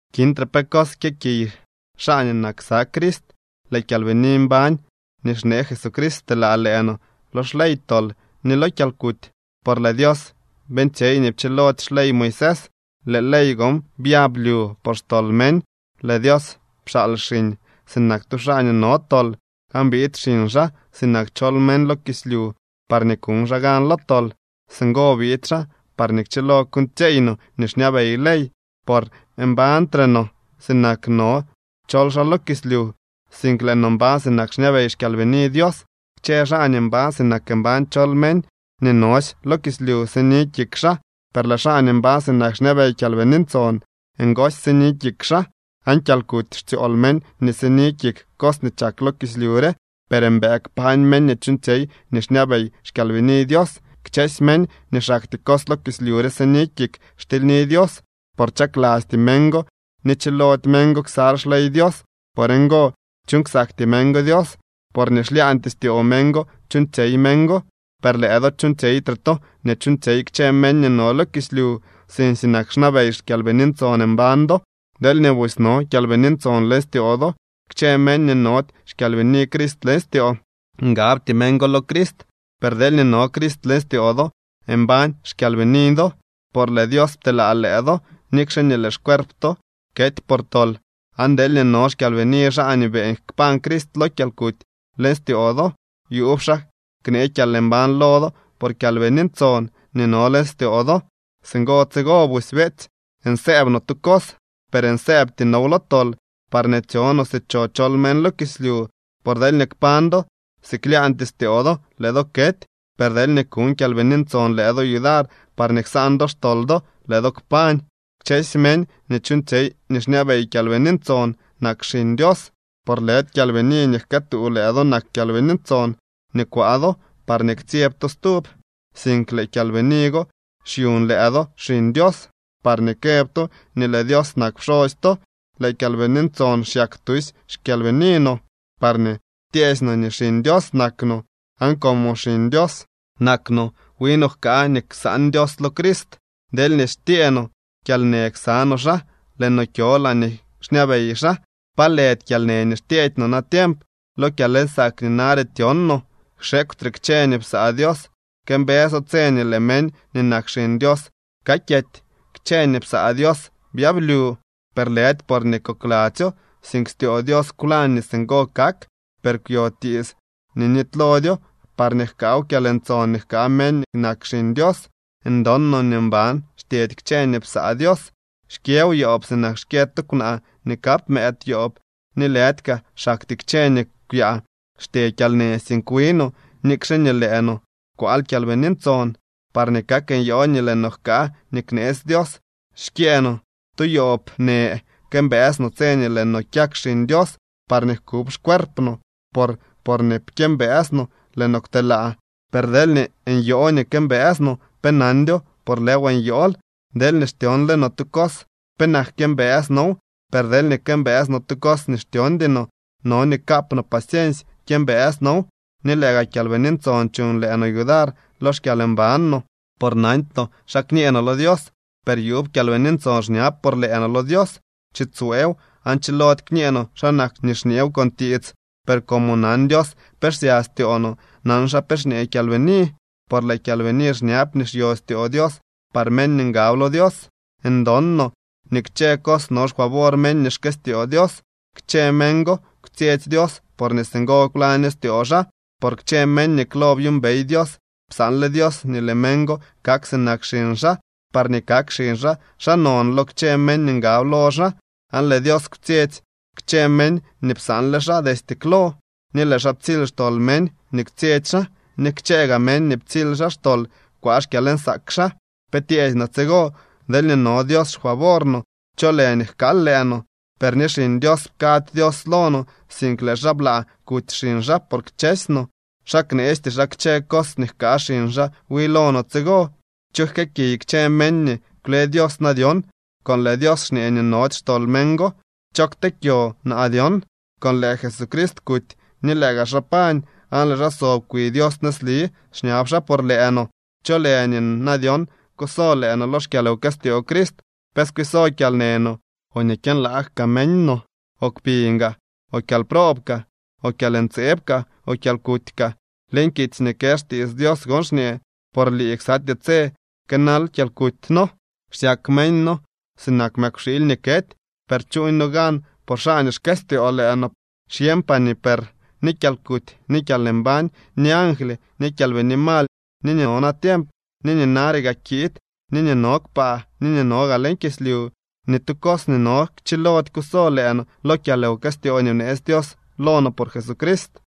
Kintre pe cos kyëkiy xaa nii nak ksa Crist. Lëë kyalbini mbañ nii xnee Jesucrist pteelaa lëë no lo xley tol ni lo kyalkuty. Por lëë Dios beeñtsyey nii pchilody xley Moisés. Lëë ley go byab lyu por xtol meñ. Lëë Dios pxaal xiñ sinak tu xaa nii no tol, aan biid xiñ xaa sinak chol meñ lo kislyu, parñee kuñ xaa gan lo tol. Singo biid xaa parñee kchilo kuuñtsyeey no nii xñabey ley, por mbañtre no sinak no chol xaa lo kislyu, sink lëë no mbañ sinak xñabey xKyalbini Dios. Kchë xaa nii mbañ sinak mbañ chol meñ, nii nosy lo kislyu sini kik xaa. Per lëë xaa nii mbañ sinak xñabey Kyalbini Ntson, ngosy sini kik xaa. Aan kyalkuty xtsyool meñ nii sini kik cos nii chak lo kislyu re, per mbëë kpañ meñ nii chuuñtsyey nii xñabey xKyalbini Dios. Kchësy meñ nii xaktyee cos lo kislyu re sini kik xtilyni Dios, por chaklasty meñ go ni chilody meñ go ksal xley Dios. Por ngo chuuñ ksakty meñ go Dios, por nii xlyaañtyee styoo meñ go chuuñtsyey meñ go. Per lëë do chuuñtsyeytre to nii chuuñtsyey kchë meñ nii no lo kislyu, sink sinak xñabey Kyalbini Ntson mbañ do, deelñee busy no Kyalbini Ntson leñ styoo do. Kchë meñ nii nody xkyalbini Crist leñ styoo, ngabty meñ go lo Crist. Per deelñee no Crist leñ styoo do, mbañ xkyalbini do, por lëë Dios pteelaa lëë do, nikxe nii lëë xcuerp to kety por tol. Aan deelñee no xkyalbini xaa nii beeñ kpañ Crist lo kyalkuty leñ styoo do, yuub xaa knee kyalmbañ lo do por Kyalbini Ntson nii no leñ styoo do. Singo tsigo busy, beetsy, nsëëb no tu cos, per nsëëbty now lo tol, parñee tsyo no si cho chol meñ lo kislyu. Por deelñee kpañ do si klaañtyee styoo do, lëë do kety. Per deelñee kuñ Kyalbini Ntson lëë do yudar parñee ksaan do xtol do, lëë do kpañ. Kchësy meñ nii chuuñtsyey nii xñabey Kyalbini Ntson nak xiñ Dios. Por lëdy kyalbini nii jkëëtuu lëë do nak Kyalbini Ntson nii kwaa do, parñee ktsyeb to stub, sink lëë kyalbini go xyuñ lëë do xiñ Dios parñee këb to nii lëë Dios nak pxosy to. Lëë Kyalbini Ntson xyak tusy xkyalbini no parñee tyeesy no nii xiñ Dios nak no. Aan como xiñ Dios nak no, wi no jkaa nii ksaan Dios lo Crist. Deelñee xtyee no kyalnë ksa no xaa, lëë no kyo laañee xñabey xaa. Pa lëdy kyalnë nii xtyeedy no natiemp lo kyalnsaak nii nare tyon no. Xekwtre kchë nii psaa Dios këmbëso tse nii lëë meñ nii nak xiñ Dios kakyety. Kchë nii psaa Dios byablyu, per lëdy porñee kokladzyo, sink styoo Dios kwlañ nii singo kak. Per kwyo tiits nii nitylodyo, parñee jkaaw kyalntson nii jkaa meñ nii nak xiñ Dios. Ndon no nii mban xtyedy kchë nii psaa Dios. Xkyëw yoob sinak xkyë tu kwnaa nii kap mëëd yoob. Ni lëdy kaa xaktyee kchë nii kwyaa xtye kyalnë, sink wi no, nikxe nii lëë no kwaal Kyalbini Ntson, parñee kak nyoo nii lëë no jkaa nii kneetsy Dios. Xkyëë no tu yoob në, këmbëës no tse nii lëë no kyak xiñ Dios, parñee jkub xcuerp no. Por porñee pkyëmbëës no, lëë no kwtelaa. Per deelñee nyoo nii këmbëës no, pe nandyo, por lëëw nyool. Deelñee xtyonle no tu cos, penak kyëmbëës now. Per deelñee këmbëës no tu cos nii xtyondy no, no nii kaap no paciensy kyëmbëës now. Ni lëë gaa Kyalbini Ntson chuñ lëë no yudar lo xkyalmban no. Por nandy no xa kñee no lo Dios, per yuub Kyalbini Ntson xñab por lëë no lo Dios. Tsiitsyweew aan chilody kñee no xa nak nii xñeew con tiits. Per como nan Dios pe xsya styoo no, nan xaa pe xñee Kyalbini, por lëë Kyalbini xñab nii xyo styoo Dios par meñ nii ngab lo Dios. Ndon no nii kchë cos no xfavor meñ nii xkëstyoo Dios. Kchë meñ go kwtsyetsy Dios porñee singo kwlaño styoo xaa. Por kchë meñ nii klo byuumbey Dios, psaanle Dios nii lëë meñ go kak sinak xiñ xaa, parñee kak xiñ xaa xaa non lo kchë meñ nii ngab lo xaa. Aan lëë Dios kwtsyetsy kchë meñ nii psaanle xaa destye klo, ni lëë xaa ptsily xtol meñ nii kwtsyetsy xaa, ni kchë gaa meñ nii ptsily xaa xtol kwaa xkyalnsaak xaa. ¿Pe tyeesy no tsigo? Deelñee no Dios xfavor no, ¿cho lë nii jkaal lëë no? Per ni Xiñ Dios pkady Dios lo no, sink lëë xaa blaa kuty xiñ xaa por kchësy no. ¿Xa kneesty xaa kchë cos nii jkaa xiñ xaa wi lo no tsigo? ¿Cho jkëëkiy kchë meñ nii kwle Dios na dyon?, con lëë Dios xñee nii nody xtol meñ go. ¿Cho ktee kyo na dyon?, con lëë Jesucrist kuty ni lëë gaa xaa pañ, aan lëë xaa sob kwi Dios nëzli, xñab xaa por lëë no. ¿Cho lë nii na dyon kuso lëë no lo xkyalwkëstyoo Crist? ¿Pe skwiso kyalnë no, o nii kyënlaag kaa meñ no, o kpiñ gaa, o kyalproob kaa, o kyalntseeb kaa, o kyalkuty kaa? Leñ kitsy nii kë xtiits Dios gon xñee: Por lii ksatyee tse kënal kyalkuty noo. Xsyak meñ noo sinak mëkwxiily nii kety. Per chuuñ no gan por xaa nii xkëstyoo lëë no. Xyeñpaa nii per ni kyalkuty, ni kyalmbañ, ni angly, ni kyalbini mal, ni nii no natiemp, ni nii nare gaa kiid, ni nii no kpaa, ni nii no gaa leñ kislyu, ni tu cos nii no chilody kuso lëë no lo kyalwkëstyoo nii bneetsy Dios lo no por Jesucrist.